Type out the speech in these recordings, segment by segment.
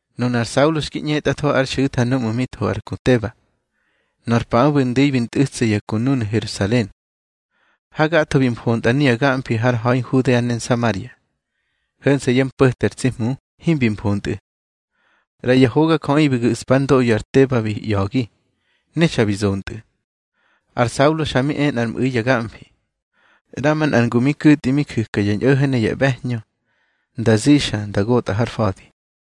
Nunar Saulo xki ꞌñetꞌatho ár xu̱tha núꞌmu̱ bi tho ar ku Teba. Nor paꞌö bi ndu̱i bi ntꞌu̱tsa ya ku núnu̱ Herusalen. Hagatho bi mfontꞌa nuya gamfi har ha̱i Nhudea ne Nsamaria. Ho̱nse̱ yá mpo̱te ar tsi Hmu himbi mfontꞌu̱. ꞌRaya hogajöꞌi bi gu̱ꞌspa ár ndoꞌyo ar Teba bi ꞌya̱gi, ne xa bi zontꞌu̱. Ar Saulo xa mi e nꞌar mꞌu̱i ya gamfi, ꞌramanꞌar ngu mi ku̱tꞌi mi ju̱ka ya ñꞌo̱ho̱ ne ya ꞌbe̱hñö nda zixa nda gotꞌar fa̱di.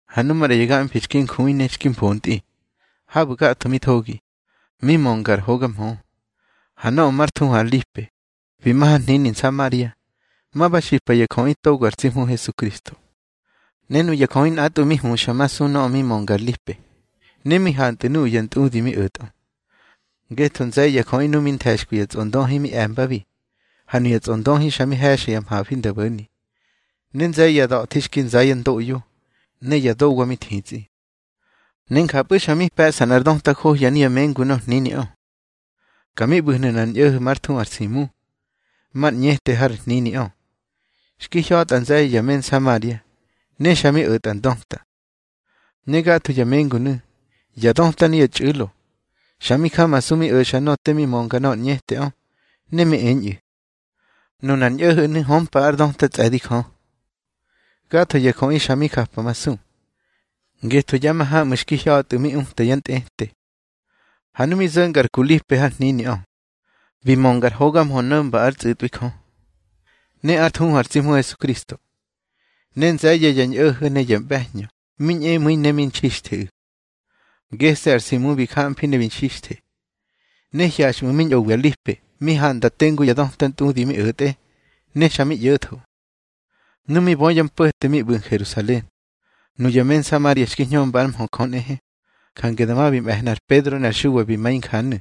Ha nu maꞌra ya gamfi xki njui ne xki mfontꞌi, habu̱ gatho mi thogi, mi mönga ar hoga mhö. Ha nöꞌö már thuhu ar Lipe, bi ma har hnini Nsamaria, ma ba xipa ya jöꞌi togo ar tsi Hmu Hesukristo. Ne nuya jöꞌi nꞌatꞌwu̱ mi huxa ma su nöꞌö mi mönga ar Lipe, ne mi hantꞌu̱ nuꞌu̱ ya ntꞌudi mi o̱tꞌö. Ngetho nze̱ye̱ ya jöꞌi nuꞌu̱ xki nthe̱xkwi ya tsꞌondöhi mi e̱mbabi, ha nuya tsꞌondöhi xa mi he̱xa ya mhafi nda bo̱ni. Ne nze̱ye̱ ya da̱thi xki nza yá ndoꞌyo, ne ya dowa mi thitsꞌi. Ne njapꞌu̱ xa mi pe̱ꞌsa nꞌar döta johya nuya mengu nor hniniꞌö. Ka mi ꞌbu̱hnu̱ nꞌar ñꞌo̱ho̱ már thuhu ar Simu, mar ñꞌete har hniniꞌö. Xki hya̱tꞌa nze̱ye̱ ya me Nsamaria, ne xa mi o̱tꞌa ndöta. Ne gatho ya mengunu̱, ya döta ne ya txꞌu̱lo, xa mi jamasu mi o̱xa nöꞌö te mi mönga nöꞌö ar ñꞌeteꞌö, ne mi eñꞌu̱: —Nunar ñꞌo̱ho̱nu̱ hömpa ár döta tsꞌe̱di Jö. Gatho ya jöꞌi xa mi japamasu, ngetho ya mahamꞌu̱ xki hya̱tꞌu̱ mi uta ya ntꞌete. Ha nu mi zo̱nga ar ku Lipe har hniniꞌö, bi mönga ar hoga mhö no̱mba ár tsꞌu̱tꞌwi Jö, ne ár thuhu ar tsi Hmu Hesukristo. Ne nze̱ye̱ ya ñꞌo̱ho̱ ne ya ꞌbe̱hñö mi ñꞌemu̱i ne mi nxixtheꞌu̱. Gese̱ ar Simu bi jamfi ne bi nxixthe. Ne hyaxꞌmu̱ mi ñꞌowi ar Lipe, mi handa tengu ya döta ntꞌudi mi o̱tꞌe, ne xa mi ꞌyo̱tho. Nu mi bö ya mpo̱te mi ꞌbu̱ Herusalen, nuya me Nsamaria xki hñömba ár mhö Jö nꞌehe, jange dama bi me̱hna ar Pedro ne ar Xuwa bi ma injanu̱.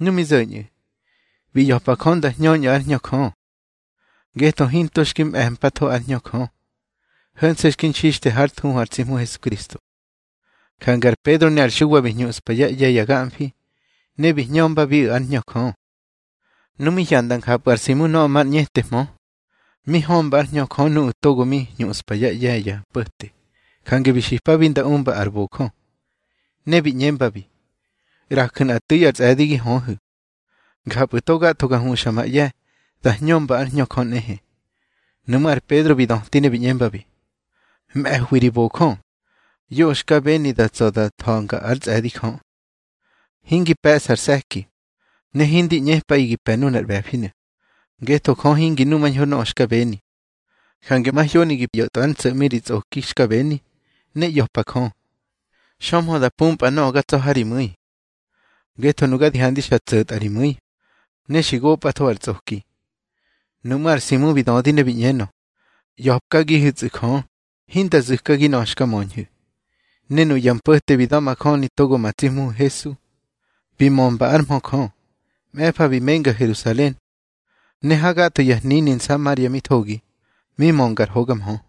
Nu mi zo̱ñꞌu̱, bi ꞌya̱pa Jö nda hñöñꞌu̱ ár Hñö Jö. Ngetho hinto xki mꞌe̱mpatho ár Hñö Jö, ho̱nse̱ xki nxixthe hár thuhu ar tsi Hmu Hesukristo. Jange ar Pedro ne ar Xuwa bi hñuꞌspa yá ꞌye̱ ya gamfi, ne bi hñömbabiꞌu̱ ár Hñö Jö. Nu mi hyanda njapꞌu̱ ar Simu nöꞌö mar ñꞌetehmö, mi hömba ár Hñö Jö nuꞌu̱ togo mi hñuꞌspa yá ꞌye̱ ya mpo̱te, jange bi xipabi nda umba ar bojö, ne bi ꞌñembabi: —ꞌRaju̱ nꞌa tu̱i ar tsꞌe̱di gi höhu̱. Njapꞌu̱ to gatho ga huxa ma ꞌye̱ da hñömba ár Hñö Jö nꞌehe. Nuꞌmú̱ ar Pedro bi döti ne bi ꞌñembabi: —Mꞌe̱hwi ri bojö. Yoꞌö xka beni da tsa̱ da tha̱nga ár tsꞌe̱di Jö. Hingi pe̱ꞌsa ar se̱ki, ne hindi ꞌñepꞌaꞌi gi pe̱ nunar ꞌbe̱finu̱, ngetho Jö hingi numañho nöꞌö xka beni. Jange mahyoni gi ꞌyo̱tꞌwa ár ntso̱ꞌmi ri tsꞌoki xka beni, ne ꞌya̱pa Jö, xömhö da pumpꞌa nöꞌö ga tsa̱ ha ri mu̱i. Ngetho nuga di handi xa tso̱tꞌa ri mu̱i, ne xi gopꞌatho ar tsꞌoki. Nuꞌmú̱ ar Simu bi dödi ne bi ꞌñenö: —ꞌYa̱pkagihu̱tsꞌu̱ Jö, hinda zu̱kagi nöꞌö xka möñhu̱. Ne nuꞌu̱ ya mpo̱te bi da̱majöni togo ma tsi Hmuhu̱ Hesu, bi mömba ár mhö Jö. Mꞌe̱fa bi menga Herusalen, ne hagatho ya hnini Nsamaria mi thogi, mi mönga ar hoga mhö.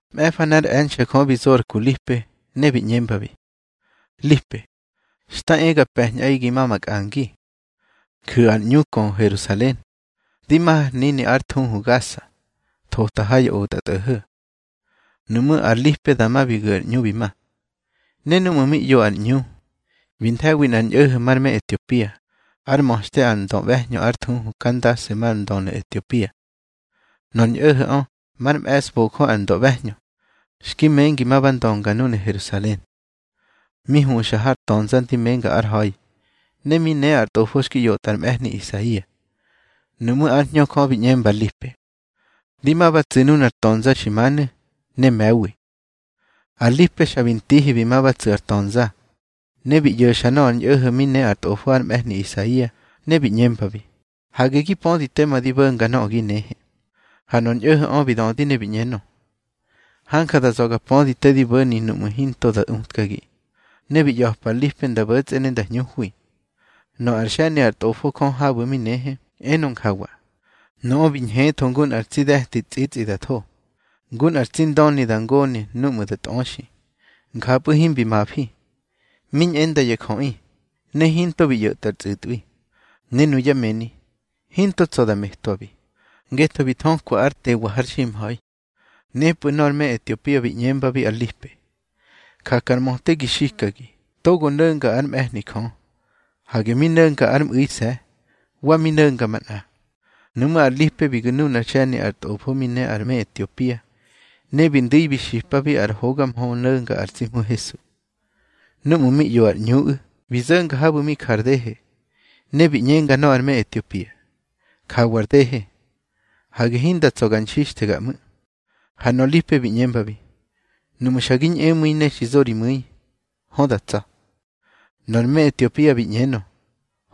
Mꞌe̱fa nꞌár e̱nxe̱ Jö bi zo ar ku Lipe, ne bi ꞌñembabi: —Lipe, xta e ga pe̱ñꞌaꞌi gi ma makꞌangi, ju̱ ar ꞌñu kö Herusalen, di ma har hnini ár thuhu Gasa, thota ha ya otꞌatꞌo̱ho̱. Nuꞌmú̱ ar Lipe dama bi gu̱ ar ꞌñu bi ma. Ne núꞌmu̱ mi ꞌyo ar ꞌñu, bi nthe̱wi nꞌar ñꞌo̱ho̱ már me Etiopia, ár ma̱xte ar ndöꞌbe̱hñö ár thuhu Kandase mar ndönu̱ Etiopia. Nor ñꞌo̱ho̱ꞌö már me̱sbojö ar ndöꞌbe̱hñö, xki mengi ma ba ndönga núnu̱ Herusalen. Mi huxa har tönza ndi menga ár ha̱i, ne mi ne ar tꞌofo xki ꞌyotꞌa ar mꞌe̱hni Isaia. Nuꞌmú̱ ár Hñö Jö bi ꞌñemba ar Lipe: —Di ma ba tsu̱ nunar tönza xi manu̱, ne me̱wi. Ar Lipe xa bi ntihi bi ma ba tsu̱ ar tönza. Ne bi ꞌyo̱xa nöꞌö ar ñꞌo̱ho̱ꞌö mi ne ár tꞌofo ar mꞌe̱hni Isaia, ne bi ꞌñembabi: —Hage gi pödi tema di bo̱nga nöꞌö gi nehe. Ha nor ñꞌo̱ho̱ꞌö bi dödi ne bi ꞌñenö: —Hanja da za̱ ga pödi te di bo̱ni nuꞌmu̱ hinto da utkagi. Ne bi ꞌya̱pa ar Lipe nda bo̱tsꞌe ne nda hñuhwi. Nöꞌö ar xe̱ni ár Tꞌofo Jö habu̱ mi nehe, enö njawa: Nöꞌö bi ñhetho ngu nꞌar tsi de̱ti tsꞌitsꞌi da tho. Ngu nꞌa tsi ndöni da ngone núꞌmu̱ da tꞌöxi, njapꞌu̱ himbi mafi. Mi ñꞌenda ya jöꞌi, ne hinto bi ꞌyo̱tꞌwa ar tsꞌu̱tꞌwi. Ne nuyá mëni, hinto tsa̱ da metwabi, ngetho bi thökwa ár tewa har ximha̱i. Nepꞌu̱ nor me Etiopia bi ꞌñembabi ar Lipe: —Jakar möte gi xikagi togo no̱nga ár mꞌe̱hni Jö. Hage mi no̱nga ár mꞌu̱ise̱, wa mi no̱nga manꞌa. Nuꞌmú̱ ar Lipe bi gu̱ nunár xe̱ni ar Tꞌofo mi ne ar me Etiopia, ne bi ndu̱i bi xipabi ar hoga mhö no̱nga ar tsi Hmu Hesu. Núꞌmu̱ mi ꞌyo ar ꞌñuꞌu̱, bi zo̱nga habu̱ mi jar dehe, ne bi ꞌñenga nöꞌö ar me Etiopia: —Jawa ar dehe. Hage hinda tsa̱ ga nxixthega ꞌmu̱. Ha nor Lipe bi ꞌñembabi: —Nuꞌmu̱ xa gi ñꞌemu̱i ne xi zo ri mu̱i, hö da tsa̱. Nor me Etiopia bi ꞌñenö: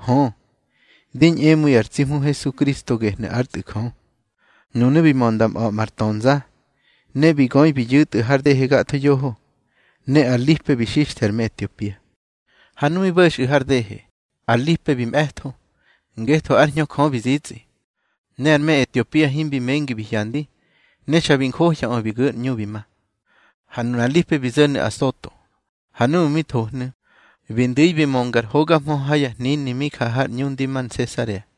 —Hö, di ñꞌemu̱i ar tsi Hmu Hesukristo gehnu̱ ár Tꞌu̱ Jö. Nunu̱ bi mö nda mꞌa̱ꞌma ar tönza, ne bi göi bi yu̱tꞌu̱ har dehe gatho yoho. Ne ar Lipe bi xixthe ar me Etiopia. Ha nu mi bo̱xꞌu̱ har dehe, ar Lipe bi mꞌe̱tho, ngetho ár Hñö Jö bi zitsꞌi. Ne ar me Etiopia himbi mengi bi hyandi, ne xa bi njohyaꞌö bi gu̱ ar ꞌñu bi ma. Ha nunar Lipe bi zo̱nu̱ Asoto. Ha núꞌmu̱ mi thohnu̱, bi ndu̱i bi mönga ar hoga mhö ha ya hnini mi ja har ꞌñu ndi ma Nsesarea.